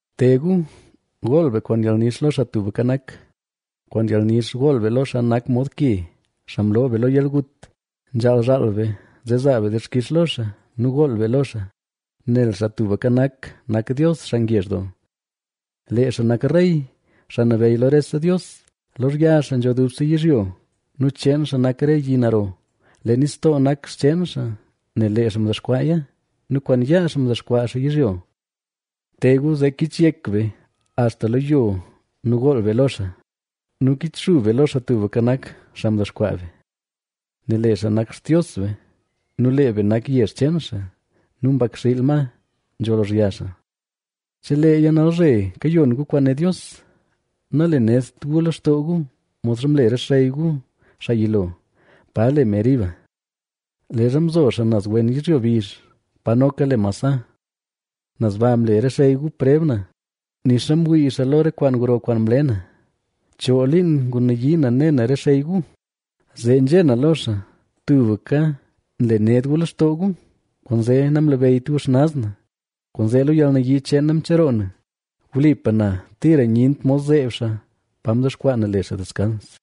¡Te gu, gool be kwaan yalnix lo Xaa Tubka Nak! ¡Kwaan yalnix gool be lo xaa nak mod ke, xaa mloo be lo yalgut! Nzhaal zhaal be, zee zaa be dixkix lo xaa nu gool be lo xaa. Nel Xaa Tubka Nak, nak Dios xaa ngezh doo, lee xaa nak Rey, xaa nabeyy lo rese dios. Lozhya xaa nzho dubse yizhyo nu cheen xaa nak re yi naro. Lee nistoo nak xcheen xaa nel lee xaa mdexkwaaya nu kwaan yaa xaa mdexkwaa xaa yizhyo. Te gu, zee kichyek be axta lo yo nu gool be lo xaa nu kichxub be lo Xaa Tubka Nak, xaa mdexkwaa be; nel lee xaa nak Xtios be nu lee be nak yezh cheen xaa nu mbakxiil ma nzho lozhya xaa. Cheleeya nalzhe kayon gu kwaan né Dios: “Nalenedt gu lextoo gu modxa mle re xey gu xaa yilo, pa le Meriba, leezha mzo xaa naz wen yizhyo bizh, pa noka le Masaha. Naz ba mle re xey gu preb na, nixa mwii xaa lo re kwaan gro kwaan mle na. Choo liin ngunayii na ne na re xey gu, zee nzhé na lo xaa: ‘Tubka nle ned gu lextoo gu, kwaanzee namlabeyyt gu xnaz na.’ Kwaanzee lo yalnayii cheen na mcheroo na, wlipa na tira nyent mod zeeb xaa pa mdexkwaa na le xaa deskans.”